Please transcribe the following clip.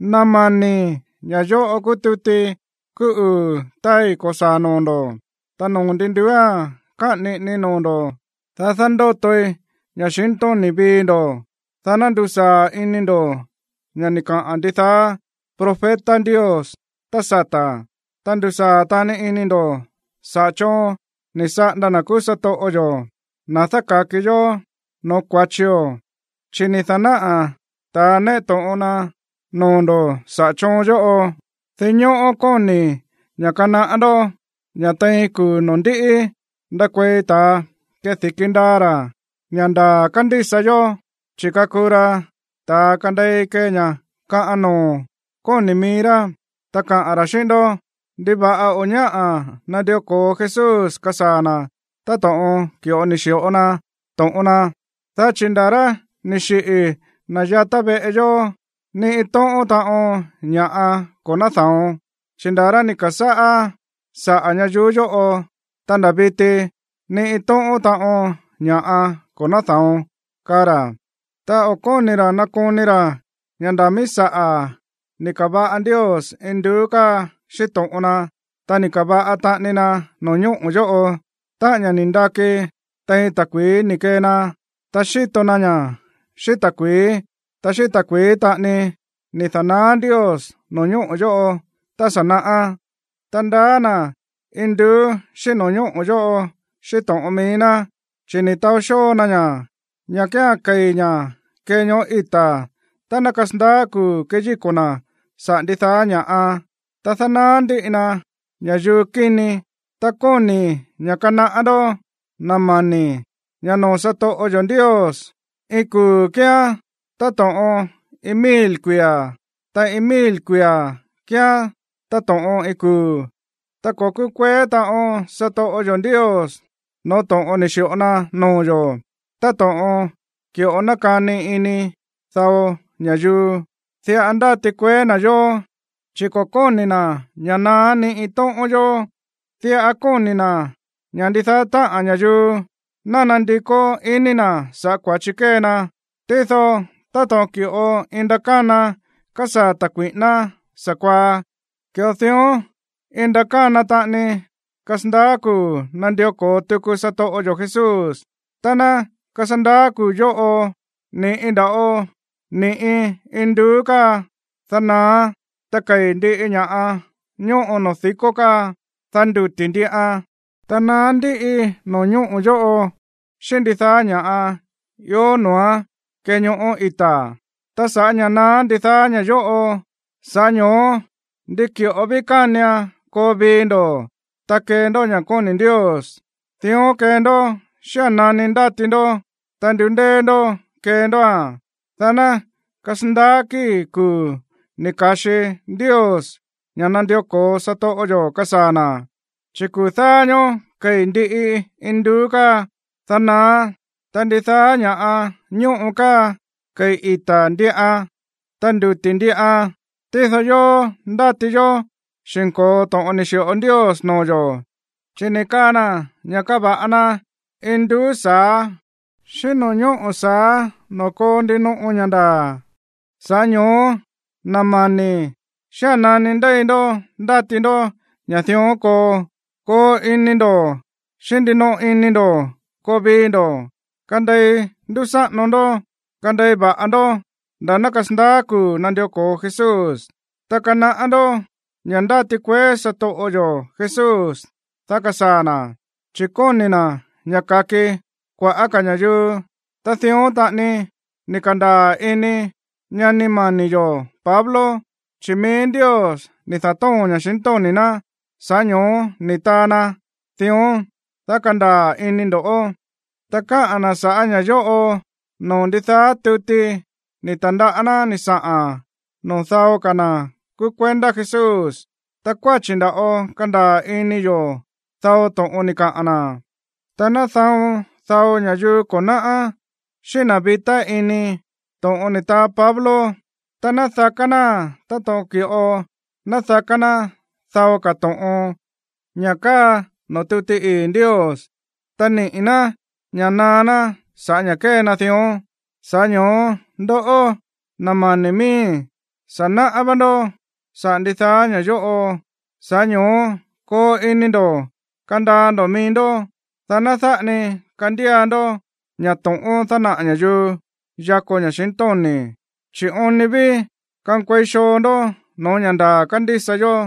Na̱ mani̱, ña̱ yóꞌo kúú tuti kúú uu̱ táai ko̱saa̱ noo̱ ndo̱, ta noo̱ ndi nduúa̱n káꞌa̱n niꞌinii noo̱ ndo̱, dá dándótoi ña̱xintóni̱ vii ndo̱, dá ná ndusaa̱ ini ndo̱ ña̱ ni̱ kaꞌa̱n ndidaá profeta Ndios tá sata̱, ta ndusaa̱ taꞌani ini ndo̱ saꞌa̱ choon ni̱ saꞌanda na̱ kúú satoꞌo yo̱, na̱ dáka̱ki yó no̱ó kua̱chio̱, chi̱ ni̱ da̱náꞌa̱ ta̱a néꞌe to̱ꞌon na noo̱ ndo̱ saꞌa̱ choon yóꞌo. Dinñóꞌó kóni̱i̱ ña̱ kanaꞌá ndó ña̱ tein kuu̱ noo̱ ndiꞌi ndakuei ta̱a kedi̱ki ndaa ra̱ ña̱ ndaa̱ kándísa yó, chi̱ kakuu ra ta̱a kandei kee ña̱ kaꞌan noo̱ kóni̱ mií rá. Ta kaa ra̱ xíꞌín ndó: “¿Ndiva̱ꞌa o̱ ñáꞌa̱ nandió ko̱o Jesús kasaa̱ na̱ táto̱ꞌon ki̱ꞌo ni̱ xi̱ꞌo na to̱ꞌon na? Dá chi̱ nda̱ rá ni̱ xiꞌi̱ na̱ yatá veꞌe yó, ni iin tóꞌón taꞌon ña̱ꞌa ko̱ náda̱on. Chi̱ nda̱ rá ni̱ ka̱sáꞌá saꞌa̱ ñayuú yóꞌo, ta nda̱ viti, ni iin tóꞌón taꞌon ña̱ꞌa ko̱ náda̱on”, kaa ra̱. Ta o̱ kóni̱ ra̱ nakoni ra̱ ña̱ nda̱ míí saꞌa̱ ni̱ ka̱va̱ꞌa Ndios induú káa xíꞌín to̱ꞌon na, ta ni̱ ka̱va̱ꞌa taꞌani na no̱ñóꞌo̱ yóꞌo, táꞌa̱n ña̱ ni̱ ndaki tein ta̱kui̱í ni̱ kee na, ta xíto na ña̱ xíꞌín ta̱kui̱í. Ta xíꞌín ta̱kui̱í taꞌani ni̱ da̱naá Ndios no̱ñóꞌo̱ yóꞌo tá sa̱ naꞌá. Ta ndaá na̱ induú xíꞌín no̱ñóꞌo̱ yóꞌo xíꞌín to̱ꞌon mií ná, chi̱ ni̱ taó xóo na ña̱, ña̱ kía̱n kei̱ ña̱ kee ñoꞌó ita̱ tá ná kasandaá kuu̱ keyíko̱ na̱ saꞌa̱ ndidaá ña̱ꞌa, ta dánaá ndíꞌi na ña̱yuu kíni. Ta kóni̱i̱ ña̱ kanaꞌá ndó, na̱ mani̱, ña̱ noo̱ satoꞌo yo̱ Ndios, iin kuu̱ kíán táto̱ꞌon iin mil kuia̱, ta iin mil kuia̱ kíán táto̱ꞌon iin kuu̱. Ta ko̱ kúkueé taꞌon satoꞌo yo̱ Ndios no̱ó to̱ꞌon ni̱ xi̱ꞌo na noo̱ yo̱, táto̱ꞌon ki̱ꞌo nákani ini dao ña̱yuu. Diꞌa ndáti kueé na̱ yó, chi̱ ko̱ kóni̱ na̱ ña̱ naá ni iin tóꞌón yó, diꞌa kóni̱ na̱ ña̱ ndidaá táꞌa̱n ña̱yuu ná nandikó iní na̱ sa̱ꞌá kua̱chi kée na. Tído táto̱ꞌon ki̱ꞌo iin ndakána kasaa̱ ta̱ kui̱ꞌíná sa̱kuaá, ki̱ꞌo dión iin ndakána taꞌani kasandaá kuu̱ nandió ko̱o tuku satoꞌo yo̱ Jesús. Tá ná kasandaá kuu̱ yóꞌo, ni̱ꞌi nda̱ꞌo ni̱ꞌi induú káa, dá naáán. Ta kei̱ ndiꞌi ña̱ꞌa ñóꞌo noo̱ di̱kó káa, dá nduti̱ ndiꞌan. Ta naá ndíꞌi no̱ñóꞌo̱ yóꞌo xíꞌín ndidaá ña̱ꞌa ió noo̱án kee ñoꞌó ita̱. Ta sa̱ꞌá ña̱ naá ndidaá ña̱ yóꞌo, sa̱ꞌá ño̱ó ndi ki̱ꞌo ví kánian koo vii ndo̱, ta kee ndó ña̱ kóni̱ Ndios. Dión kee ndó xía̱n nani ndáti ndó, ta ndundéé ndó kee ndóa̱n, dá ná kasandaá kíi̱ kuu̱ ni̱ ka̱xi Ndios ña̱ nandió ko̱o satoꞌo yo̱ kasaa̱ na̱. Chi̱ kuu̱ dáá ñóó kei̱ ndiꞌi induú káa, dá naáán, ta ndidaá ña̱ꞌa ñóꞌo káa kei̱ ita̱ ndiꞌan, ta nduti̱ ndiꞌan. Tído yóó, ndáti yó xi̱nko̱o to̱ꞌon ni̱ xi̱ꞌo Ndios noo̱ yo̱, chi̱ ni̱ kaa na̱ ña̱ kava̱ꞌa na induú sa̱á xíꞌín no̱ñóꞌo̱ sa̱á noo̱ koo ndinoꞌo ña̱ ndaa̱. Sa̱ꞌá ño̱ó, na̱ mani̱, xía̱n nani ndéi ndó ndáti ndó ña̱ dión koo, koo ini ndo̱ xíꞌín ndinoꞌo ini ndo̱ koo vii ndo̱, kandei ndúsáꞌano ndó, ta kandei va̱ꞌa ndó nda̱ ná kasandaá kuu̱ nandió ko̱o Jesús. Ta kanaꞌá ndó ña̱ ndáti kueé satoꞌo yo̱ Jesús, dá kasaa̱ na̱, chi̱ kóni̱ na̱ ña̱ ka̱ki kua̱ꞌá ka̱ ña̱yuu. Ta dión taꞌani ni̱ ka̱ndaa̱ ini ñani mani̱ yo̱ Pablo, chi̱ mií Ndios ni̱ da̱tóo̱n ña̱xintóni̱ ná, sa̱ꞌá ño̱ó ni̱ taa na dión, dá kandaa̱ ini ndo̱. Ta káꞌa̱n na̱ sa̱ꞌá ña̱ yóꞌo noo̱ ndidaá tuti ni̱ ta̱ndaꞌá ná ni̱ saꞌa̱n noo̱ dao ka̱ na̱ kúú kuendá Jesús. Ta kuáchi̱ nda̱ꞌo kándaa̱ ini yo̱ dao to̱ꞌon ni̱ kaꞌa̱n na̱. Ta náda̱on dao ña̱yuu ko̱ náꞌá, xíꞌín na̱ vitá ini, to̱ꞌon ni̱ taa Pablo, ta nádaká náa̱n táto̱ꞌon ki̱ꞌo nádaká ná dao ka̱ to̱ꞌon, ña̱ káa noo̱ tuti ii̱ Ndios. Ta niꞌi̱ ná ña̱ naá ná sa̱ꞌá ña̱ kée na dión. Sa̱ꞌá ño̱ó, ndoꞌó, na̱ mani̱ miíi̱, sa̱ náꞌá vá ndó sa̱ꞌá ndidaá ña̱ yóꞌo, sa̱ꞌá ño̱ó koo ini ndo̱ kandaa ndo̱ mií ndó, dá ná dáꞌa ni kandía ndó ña̱ to̱ꞌón dánaꞌa̱ ña̱yuu yako ña̱xintóni̱, chi̱ oon ni ví kankuei xoo ndó no̱ó ña̱ ndaa̱ kándísa yó.